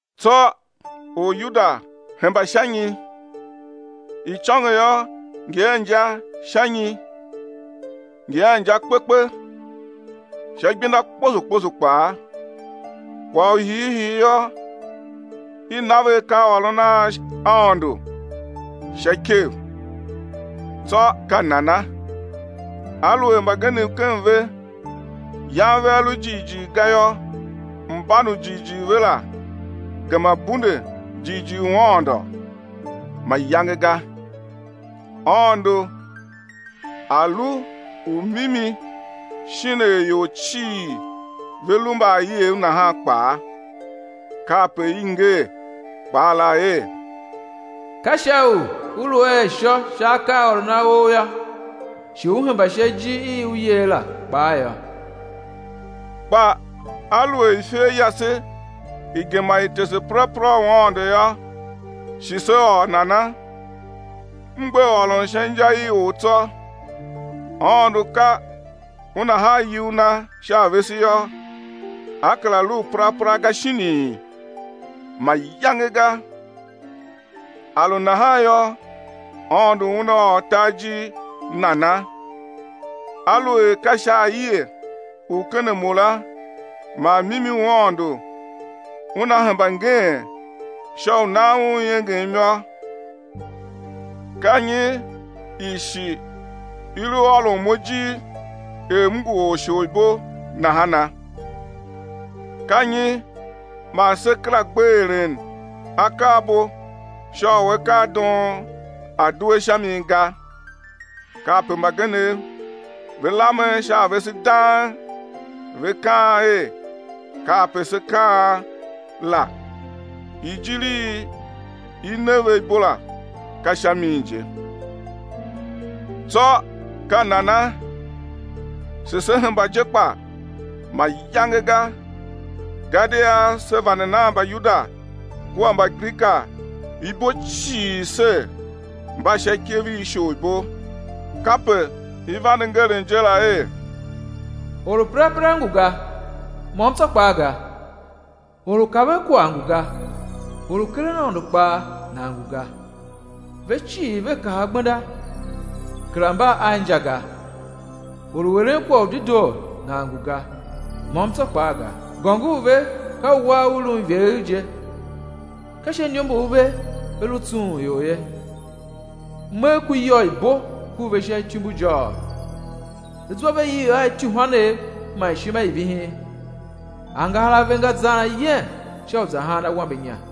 Tsô Oryuda hemba sha nyi? Icôngo yô, ngi a inja sha nyi? Ngi a inja kpe kpe, sha igbenda kposo kposo kpaa. Kwagh u hiihii yô, i na ve akaaôron a Aôndo sha ikev. Tsô ka nana? Aluer mbagenev ken ve yan vea lu jighjigh ga yô, mban u jighjigh ve la gema bunde jighjigh u Aôndo? Mayange ga, Aôndo A̱ lu u mimi shin er ior cii ve lu mbaaiev nahan kpaa; kape i nger kpaa la er: Ka sha u Ú lu a ishô sha akaaôron a Ou yô, shi Ú hemba sha ijir i U yer la kpaa yô. Kpa aluer ifer yase i gema i tese perapera u Aôndo yô, shi sé ôr nana? M gbe ôron sha inja i or tsô. Aôndo ka Una haa iyugh Na sha a vese yô, A kera lu u perapera ga shinii? Mayange ga. A lu nahan yô, Aôndo Una ôr tar ijir nana? Aluer ka sha aie u ken a mo la man mimi u Aôndo una hemba ngeen sha u nan Un iengem yô, ka nyi i shi i lu ôron mo ijir er m ngu orsholibo nahana? Ka nyi man se kera gbe eren akaabo sha u akaadoon a̱ due sha mi ga? Kape mbagenev ve lamen sha a vese dang, ve kaan er kape se kaan la. Ijir i i ne ve ibo la ka sha min je. Tsô ka nana? Shi se hemba je kpa? mayange ga. Gadia se vande nan Mbayuda kua Mbagrika ibo cii ser, mba sha ikev i isholibo. Kape i vande ngeren je la er: Or u perapera ngu ga, môm tsô kpaa ga, or u kaven kwagh ngu ga, or u keren Aôndo kpaa nan ngu ga. Ve cii ve kaha gbenda, kera mba a inja ga, or u eren kwagh u dedoo nan ngu ga, môm tsô kpaa ga. Gôngor ve ka uwar u lun ivegher je, ka sha iniombor ve ve lu tsughun ior ye, megh ku iyô i bo ku ve sha ityumbujôôgh. Zwa ve iv a ityuhwanev man ishima i vihin, angahar a ve nga zan ayem sha u za haan awambe inya,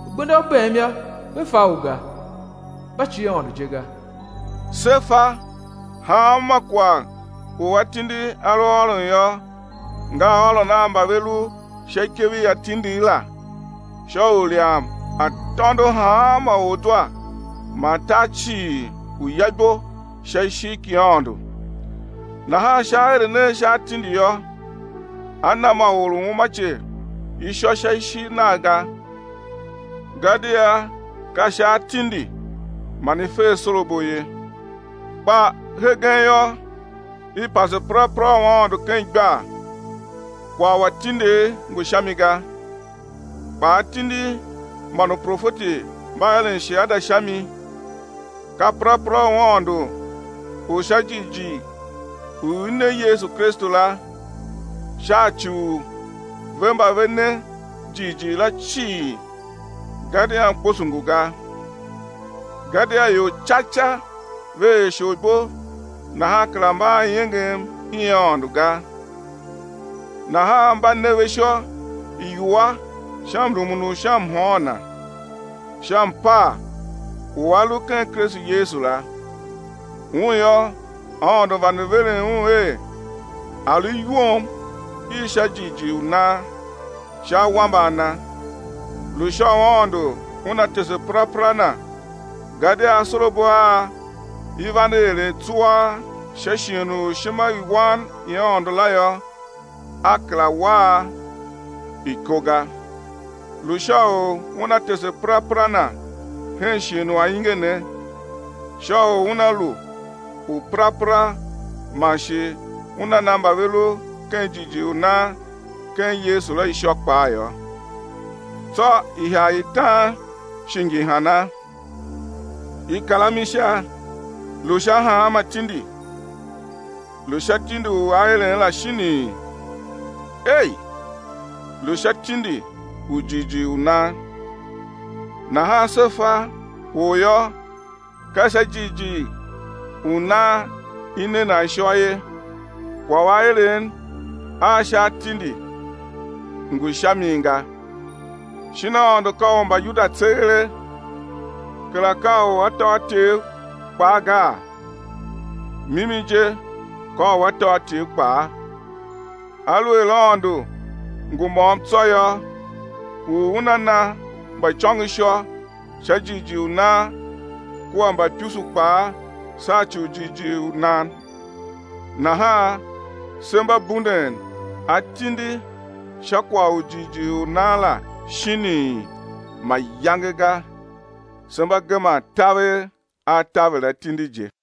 Gbenda u bem yô, ve fa u ga, mba cie Aôndo je ga. Se fa, hanma kwagh u atindi a lu ôron yô, nga ôron a mba ve lu sha ikev i atindigh la sha u ilyam a̱ tôndo hanma or zwa man tar cii u̱ ya ibo sha ishigh ki Aôndo. Nahan sha aeren a sha atindi yô, a na ma or u umace ishô sha ishigh Nagh ga, gadia ka sha atindi man i fe asorabo ye. Kpa hegen yô, i pase perapera u Aôndo ken igbar, kwagh u atindigh ngu sha mi ga, kpa atindi man uprofeti mba eren shiada sha mi, ka perapera u Aôndo u sha jighjigh u i ne [Yesu] Kristu la, sha ci u ve mba ve ne jighjigh la cii, gadia mkposo ngu ga. Gadia ior ca ca ve er isholibo nahan kera mba a iengem i Aôndo ga. Nahan mba ne ve ishô iwua sha mrumun u sha mhôôn Na, sha mpaa u a lu ken Kristu Yesu la. Un yô, Aôndo vande veren Un er A̱ lu iwom i sha jighjigh u nan, sha awambe a Na. Lu sha u Aôndo Una tese perapera Na gadia asorabo a i vande eren tsuaa sha shighe u ishimawan i Aôndo la yô, A kera wa a iko ga. Lu sha u Una tese perapera Na hen shighe u ainge ne, sha u Una lu u perapera man shi Una na mba ve lu ken jighjigh u nan ken Yesu la ishô kpaa yô. Tsô ihagh i tan shi ngi hana? I kar a mi sha. Lu sha hanma tindi? Lu sha tindi u aeren la shinii? Ei, lu sha tindi u jighjigh u nan. Nahan se fa, or yô, ka sha jighjigh u nan i ne nan ishô ye, kwagh u aeren a sha atindi ngu sha mi ga. Shin Aôndo ka u Mbayuda tseeghe? Kera ka u atôatyev kpaa gaa? Mimi je, ka u atôatyev kpaa, aluer Aôndo ngu môm tsô yô, u Una na mbaicôngo ishô sha jighjigh u nan, kua mbaipusu kpaa sha ci u jighjigh u nan. Nahan se mba bunden atindi sha kwagh u jighjigh u nan la shinii? Mayange ga, se mba geman taver a taver atindi je.